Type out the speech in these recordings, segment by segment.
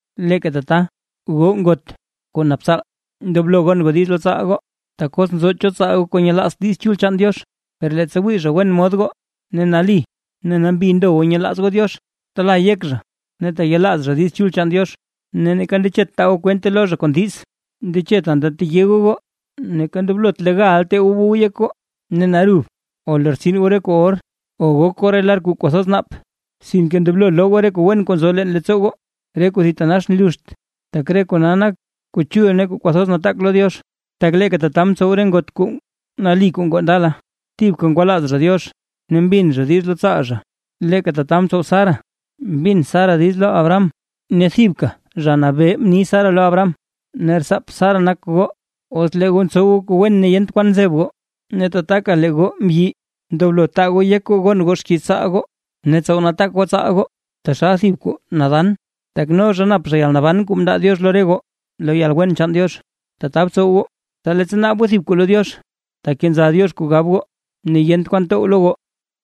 Leeka tata, goo ngot kuu nap tsaal, ndoblo gon goo diiz lo tsaal goo. Tak os nzo cho tsaal goo kuu nyelaazt Diiz Chul chaan Diox, per leettsa wii zha wen mod goo ne nali ne nambi ndo goo nyelaaz goo Diox, tala yek zha ne teyelaaz zha Diiz Chul chaan Diox ne neeka ndechet taa goo kwente lo zha kon diiz. Ndechet anta teye goo goo, neeka ndoblot legal tee goo bow yek goo ne narub o lortsin goo re kuu or o gok goo re lar kuu kwathoz naap, sinke ndoblo loo goo re kuu wen kuu nzo leen leettsoo goo, re kuu thitanax nluxt, tak re kona nak kuu chul ne kwathoz nataak lo Diox. Tak leeka tata mtsow re ngot kuu nali kuu ngoo ndala; thibka ngwalaaz zha Diox ne mbin zha diiz lo tsaal zha. Leeka tata mtsow Sara, mbin Sara diiz lo Abraham ne thibka: “Zha Nabee”, mni Sara lo Abraham. Ne rtsaap Sara nak goo, os lee goo ntsow goo kuu wen ne yent kwan nzeb goo. Ne tataka lee goo mbyi, ndoblo taa goo yek goo gon goo xkiiz tsaal goo, ne btsow nataak goo tsaal goo taxal thib kuu nadan, tak no zha nap yalnaban kuu mndaa Diox lo re goo lo yalwen chaan Diox. Tata btsow goo, tsa leettsa naab goo thib kuu lo Diox, takenza Diox kuu gab goo ne yent kwan tow lo goo.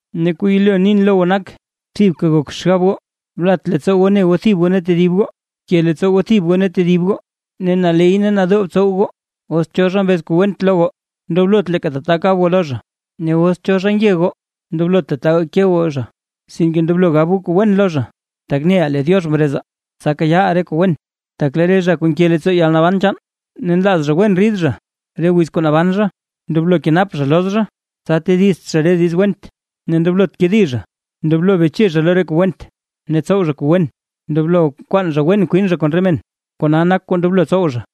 Ne kuu yelo nin lo goo nak, thibka gok xgab goo, blat leettsoo goo ne goo thib goo ne tedib goo, bke leettsoo goo thib goo ne tedib goo ne naley ne nadoo btsow goo. Os cho zha mbez kuu went lo goo, ndoblot leeka tata kab goo lo zha, ne os cho zha nge goo, ndoblot tataga ke goo zha. Sinke ndoblo gab goo kuu wen lo zha, tak neʼaa lee Diox mrezaa, tsa kayaaʼaa re kuu wen. Tak: Lee re zha kuu nke leettsoo yalnaban chaan ne nlaaz zha wen rid zha re wiz kuu naban zha, ndoblo kenap zha loz zha, tsa tedizt zha re diiz went, ne ndoblot kedi zha; ndoblo beche zha lo re kuu went ne tsow zha kuu wen; ndoblo kwaan zha wen kwin zha kon re men, kona nak kuu ndoblo tsow zha.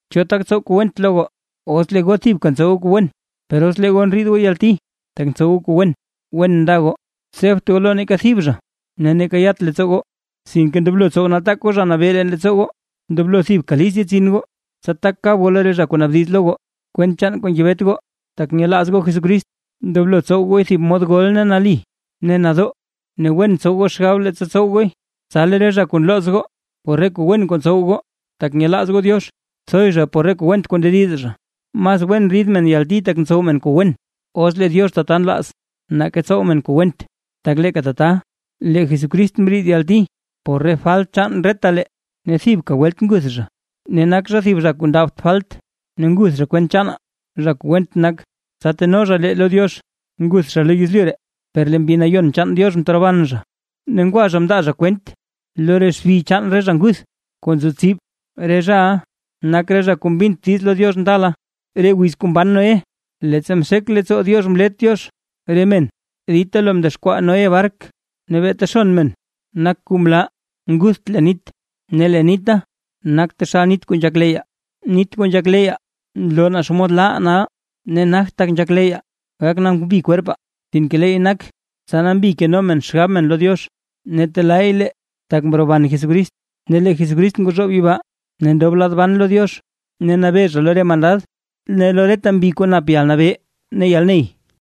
¿Cho tak tsow kuu went lo goo, os lee goo thibka ntsow goo kuu wen? Per os lee goo ndriid goo yalti, tak ntsow goo kuu wen, wen nda goo. Tsebt goo lo neeka thib zha ne neeka yat leettsoo goo, sinke ndoblo tsow nataak goo Zha Nabee leen leettsoo goo. Ndoblo thibka list yetsin goo, tsa tak kab goo lo re zha kuu naabdiz lo goo, kwent chaan kuu ngebet goo, tak nyelaaz goo Jesucrist. Ndoblo tsow gooy thib mod gol ne nadoo, ne wen btsow goo xgab leettsa tsow gooy, tsa lee re zha kuu nlooz goo por re kuu wen kuu ntsow goo, tak nyelaaz goo Diox, thoy zha por re kuu went kuu ndediz zha. Mas wen rid men yalti tak ntsow men kuu wen, os lee Diox tata nlaaz Diox, nake tsow men kuu went. Tak leeka tata, lee Jesucrist mriid yalti por re falt chaan retalee, ne thibka welt nguth zha. Ne nak zha thib zha kuu ndabt falt, ne nguth zha kwent chaanaa zha kuu went nak, tsa teno zha lee lo Diox. Nguth zha lo yezlyu ree, per lee Mbi Nayon chaan Diox mteroban zha. Ne ngwa zha mndaa zha kwent lo re xbi chaan re zha nguth kuu nzo tsib. Re zhaʼa nak re zha kuu mbint diiz lo Diox ndala, re wiz kuu mban Noé, leettsa mxek leettsoo Diox mlet Diox re men dita lo mdexkwaa Noé bark. Ne beeta xon men nak kuu mlaa ngutht leen nit. Ne lee nita nak taxal nit kuu nzhak leyyaa, nit kuu nzhak leyyaa nloo naa xomod laaʼaa nal. Ne nagt tak nzhak leyyaa gak nambi kwerpaa, sinke leey nak tsa nambi keno men xgab men lo Diox; ne telaay lee tak mroban Jesucrist. Ne lee Jesucrist ngwazhoob yibaa ne ndob lad ban lo Diox, ne nabee zha lo re mandad ne lo reta mbi kuu nap yalnabee ne yalney.